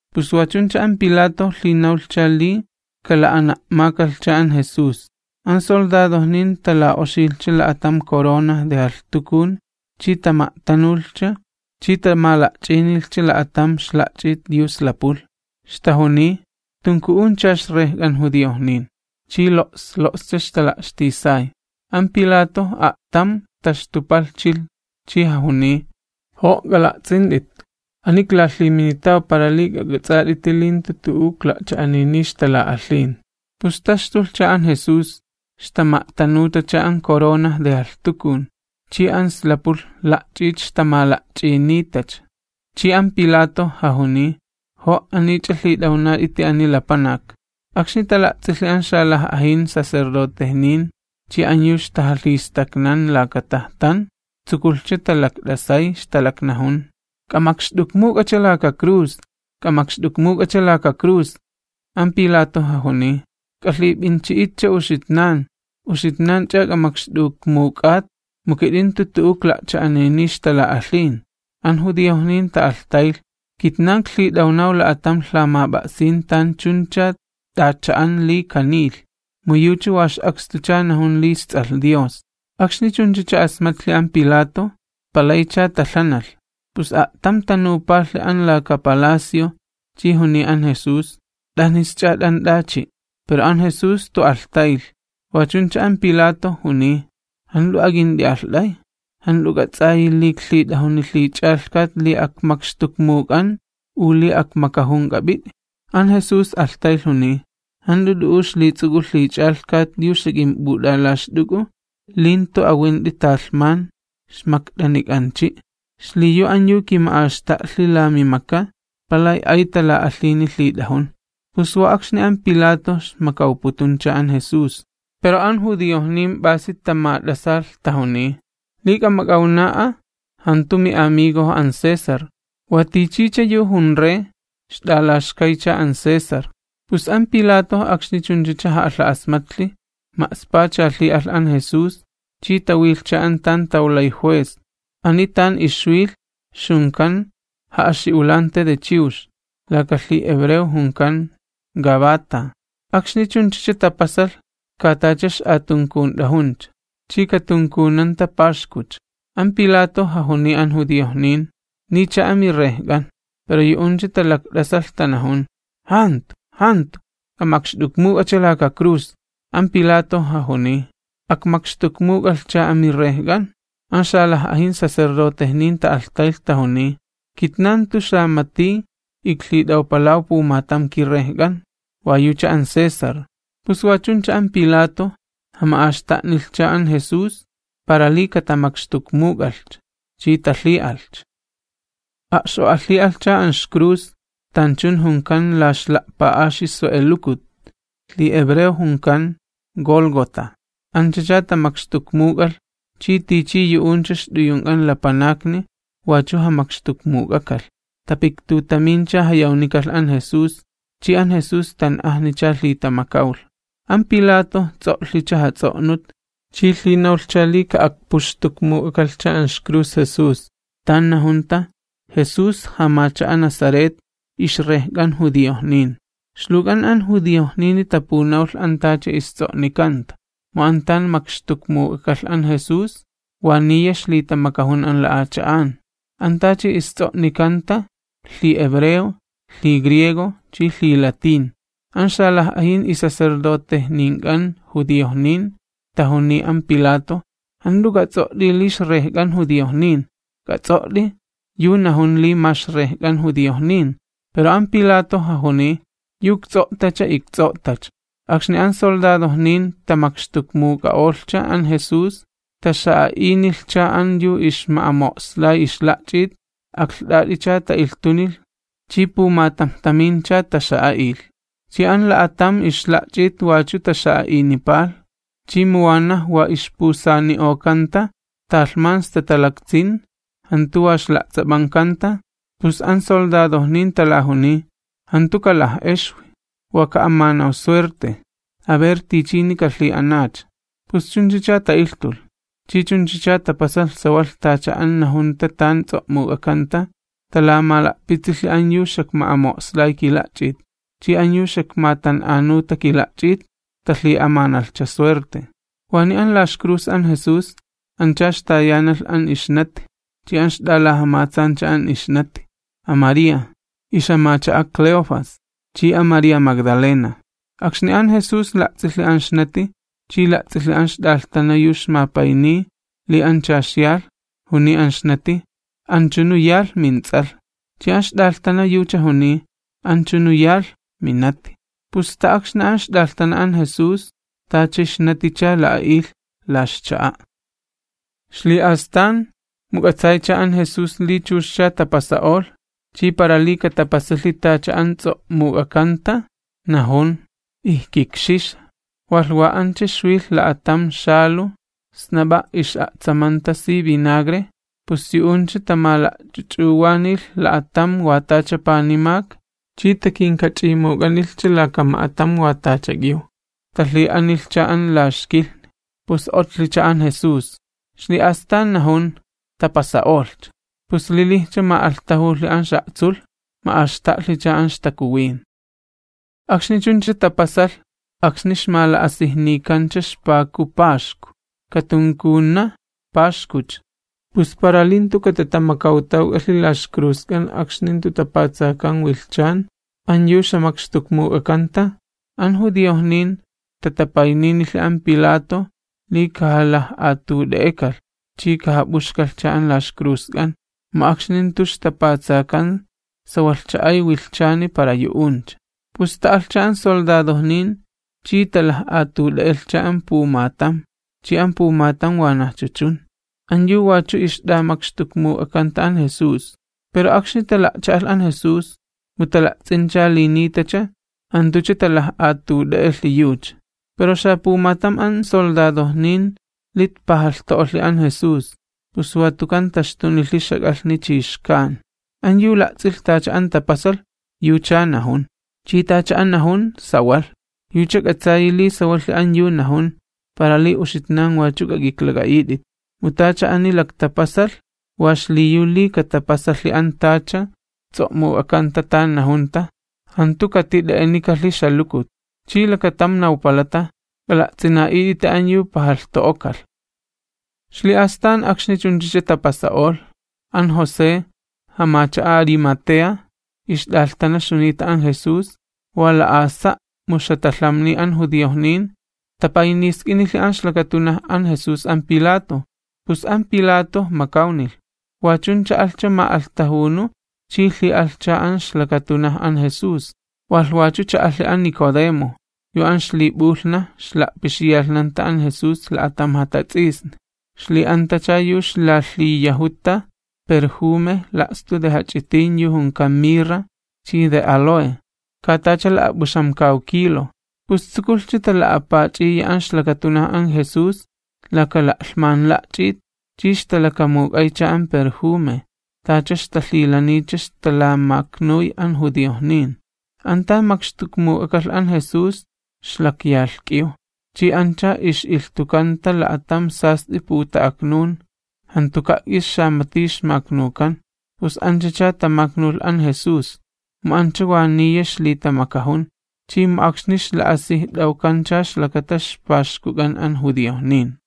Pus wa chuncha an Pilato lhinawlhcha li kala'ana'makalhcha an Jesús. An soldadojnin tala'oxilhcha la'atam corona de jalhtukun chi tama'tanulhcha chi tamala'ch'inilhcha la'atam ixla'ch'it yu slapulh, ixtajuniy: ―¡K'ajama'alht'axt'uncha ixrejk'an judiojnin! Chi lo's lo'scha, ixtala'xtisay. An Pilato a'tam taxtupalhchilh chi jajuniy: ―Jo' k'ala'ts'int'it, ani iklalhiminitaw, para li k'ak'ats'at'iti li jantu tu'u ikla'cha'aniniy ixtala'alhin. Pus taxtulhcha an Jesús, ixtama'tanutacha an corona de jalhtukun, chi an slapulh la'ch'it ixtamala'ch'initacha. Chi an Pilato jajuniy: ―¡Jo' aniych'a lhit'awnat'iti ani lapanak! Akxni tala'ts'ilhi an xalaj'ajin sacerdotejnin chi an yu ixtajalhistaknan laka tajtan, tsukulhcha talakt'asay, ixtalaknajun: ―¡K'amakxt'ukmuk'acha laka cruz! ¡K'amakxt'ukmuk'acha laka cruz! An Pilato jajuniy: ―K'alhip'inchi'itcha uxitnan, uxitnanch'a k'amakxt'ukmuk'at, mu kit'in jantu tu'u ikla'cha'aniniy ixtala'alhin. An judiojnin ta'alhtaylh: ―Kitnan iklhit'awnaw la'atam lhamap'a'sin tan chuncha t'acha'an li kaniylh, mu yucha wa ix'akstucha najun li isTs'alh Dios. Akxni chunchacha asmatlhi an Pilato, palaycha talhanalh. Pus a'tam tanupalhi an laka palacio chi juniy an Jesús: ―¿T'anisch'a t'ant'achi'? Pero an Jesús jantu alhtaylh. Wa chuncha an Pilato juniy: ―¿Jant'u ak'int'i'alht'ay? ¿Jant'u k'ats'ayi li iklhit'ajuni lhich'alhkat li akmakxtukmuk'an u li akmakajun k'ap'it'i? An Jesús alhtaylh, juniy: ―Jant'u t'u'u ixlits'uk'u lhich'alhkat yu xak'imp'ut'alaxt'uk'u li jantu awint'i talhmani ixmakt'anik'anchi', xliyu an yu kima'axta'lhi la mimaka, palay ay tala'alhini lhit'ajun. Pus wa akxni an Pilato ixmakawputuncha an Jesús, pero an judiojnin p'asi tamat'asalh, tajuniy: ―¡Li k'amak'awna'a, jantu mi'amigojo an César! ¡Wa tichicha yu jun rey, ixt'alaxkaycha an César! Pus an Pilato akxni chunchacha ja'alha'asmatlhi, ma'spacha lhi'alh an Jesús, chi tawilhcha an tan tawlay juez, ani tan ixwilh ixjunkan ja'axi'ulanti de chiwx, laka lhihebreo junkan Gabata. Akxni chuncha tapasalh, ka tacha ix'atunkunt'ajuncha, chi katunkunanta Paxkucha. An Pilato jajuniy an judiojnin: ―¡Ni'ijcha amiRejk'an! Pero yu'uncha talakt'asalh tanajun: ―¡Jantu, jantu, k'amakxt'ukmuk'acha laka cruz! An Pilato jajuniy: ―¿Akmakxtukmuk'alhcha amiRejk'an? An xalaj'ajin sacerdotejnin ta'alhtaylh tajuniy: ―Kitnan jantu xamati iklhit'awpalaw pumatam kirrejk'an, wa yucha an César. Pus wa chuncha an Pilato jama'axta'nilhcha an Jesús para li katamakxtukmuk'alhcha, chi talhi'alhcha. A'x'o'alhi'alhcha an ixcruz, tanchun junkan la Ixla'pa'axi Swe'elukut, lhihebreo junkan, Gólgota. Anchacha tamakxtukmuk'alh, chi tichi yu'uncha ixt'uyunk'an lapanakni wachu jamakxtukmuk'ak'alh, tapiktutamincha jayawnikalh an Jesús, chi an Jesús tan'ajnicha lhitamakawlh. An Pilato ts'o'lhicha jats'o'nut, chi lhinawlhcha li ka'akpuxtukmuk'akalhcha an ixcruz Jesús, tan najunta: “Jesús jamacha'a Nazaret, ixRejk'an judiojnin.” Ixluwk'an an judiojnini tapunawlh an tacha ists'o'nikanta. Mu an tan makxtukmuk'akalh an Jesús, wa niya ixlitamakajun an la'acha'an. An tacha ists'o'nikanta, lhihebreo, lhigriego chi lhilatín. An xalaj'ajin isacerdotejnink'an judiojnin tajuniy an Pilato: ―Jant'u k'ats'o't'i li: “IxRejk'an judiojnin”. K'ats'o't'i: “Yu najun li ma ixRejk'an judiojnin”. Pero an Pilato jajuniy: ―Yu ikts'o'tacha, ikts'o'tacha. Akxni an soldadojnin tamakxtukmuk'a'olhcha an Jesús, taxa'a'inilhcha an yu ixma'amo'slay ixla'ch'it, aklht'at'icha ta'ilhtunilh chi pumatamjtamincha taxa'a'ilh. Chi an la'atam ixla'ch'it wachu taxa'a'inipalh, chi mu wanaj wa ixpusani'okanta, talhman sta talaktsin, jantu wa ixla'ts'ap'ankanta, pus an soldadojnin talajuniy: ―Jantu kalaj'exwi, wa ka'amanaw suerte, a ver tichini kalhi'anacha. Pus chunchacha ta'ilhtulh. Chi chunchacha tapasalh sawalh tacha an najunta tan ts'o'muk'akanta: Talamala'pitsilhi an yu xakma'amo'slay kila'ch'it, chi an yu xakmatan'anuta kila'ch'it, talhi'amanalhcha suerte. Waniy an la ixcruz an Jesús ancha ixtayanalh an ixnati, chi an ixt'alajamatsancha an ixnati, an María, ixt'iwi Cleofas, chi an María Magdalena. Akxni an Jesús la'ts'ilhi an ixnati, chi la'ts'ilhi an ixt'alhtana yu ixmapayniy li ancha ixyalh, juniy an ixnati: ―Anchunu yalh, mints'alh. Chi an ixt'alhtana yucha juniy: ―Anchunu yalh, minati. Pus sta akxni an ixt'alhtana an Jesús, tacha ixnaticha la'a'ilh la ixcha'a'. Ixli'astan, mu k'atsaycha an Jesús li chuxcha tapasa'olh, chi para li katapasalhi tacha an ts'o'muk'akanta, najun: ―Ijkikxixa. Walh wa ancha ixwilh la'atam xaluj snap'a' ix'a'tsamanta si vinagre, pus yu'uncha tamala'ch'uch'uwanilh la'atam wa tacha panimak, chi takinkach'imuk'anilhcha laka ma'atam xak'iw hisopo, talhi'anilhcha an la ixkilhni. Akxni otlhicha an Jesús, ixli'astan najun: ―Tapasa'olhcha. Pus lilijcha ma'alhtajulhi an ix'a'tsulh, ma'axta'lhicha an ixtakuwin. Akxni chuncha tapasalh akxni ixmala'asijnikancha ixpaku Paxku, katunkuna Paxkucha, pus para li jantu katatamakawtawk'alhi la ixcruzk'an akxni jantu tapatsakan an yu ixjamakxtukmuk'akanta, an judiojnin tatapayninilhi an Pilato li kajalaj'atut'e'ek'alh chi kajap'uxkalhcha an la ixcruzk'an, mu akxni jantu ixtapatsakan sawalhcha ay wilhchani para yu'uncha. Pus ta'alhcha an soldadojnin chi talaj'atut'e'elhcha an pumatam, chi an pumatam wanajcha chun, an yu wachu ixt'amakxtukmuk'akanta an Jesús. Pero akxni tala'cha'alh an Jesús, mu tala'ts'incha li nitacha, jantucha talaj'atut'e'elhi yucha. Pero xapumatam an soldadojnin lit pajalhto'olhi an Jesús, pus watukan taxtunilhi ixjak'alhni chi xkan. An yu la'ts'ilh tacha an tapasalh, yuchaa najun. Chi tacha an najun, sawalh, yucha k'atsayi li sawalhi an yu najun, para li uxitnan wachu k'ak'iklak'a'it'it. Mu tacha ani laktapasalh wa xliyu li katapasalhi an tacha ts'o'muk'akanta tan najunta: “Jantu katit'e'enikalhi ixjalukut.” Chi lakatam nawpalata: “K'ala'ts'ina'it'iti an yu pajalhto'okalh.” Ixli'astan akxni chunchacha tapasa'olh, an José, jamacha'a Arimatea, yu wa la'asa' ixt'alhtana ixjunita an Jesús, mu ixjatalhamniy an judiojnin, tapaynisk'inilhi an ixlakatunaj an Jesús an Pilato, pus an Pilato makawnilh. Wa chuncha alhcha ma'alhtajunu chi lhi'alhcha an ixlakatunaj an Jesús. Walh wachu cha'alhi an Nicodemo, yu an ixlip'ulhnaj ixla'pixiyalhnanta an Jesús la'atam jatats'isni, ixli'antacha yu ixlalhiyajuta perjume la'stu jach'itin yu junkan mirra chi áloe, ka tacha la'ap'uxamkaw kilo. Pus tsukulhcha tala'apach'iya an ixlakatunaj an Jesús laka la'lhman la'ch'it chi ixtalakamuk'aycha an perjume, tacha ixtalhilaniycha ixtalamaknuy an judiojnin. An tan makxtukmuk'akalh an Jesús ix'alin lakatam palakch'anan, chi ancha ix'ilhtukanta la'atam sast'i puta'aknun, jantuka' k'is xamati ixmaknukan. Pus anchacha tamaknulh an Jesús, mu ancha wa niya ixlitamakajun, chi mu akxni ixla'asijt'awkancha ixlakata ixPaxkuk'an an judiojnin.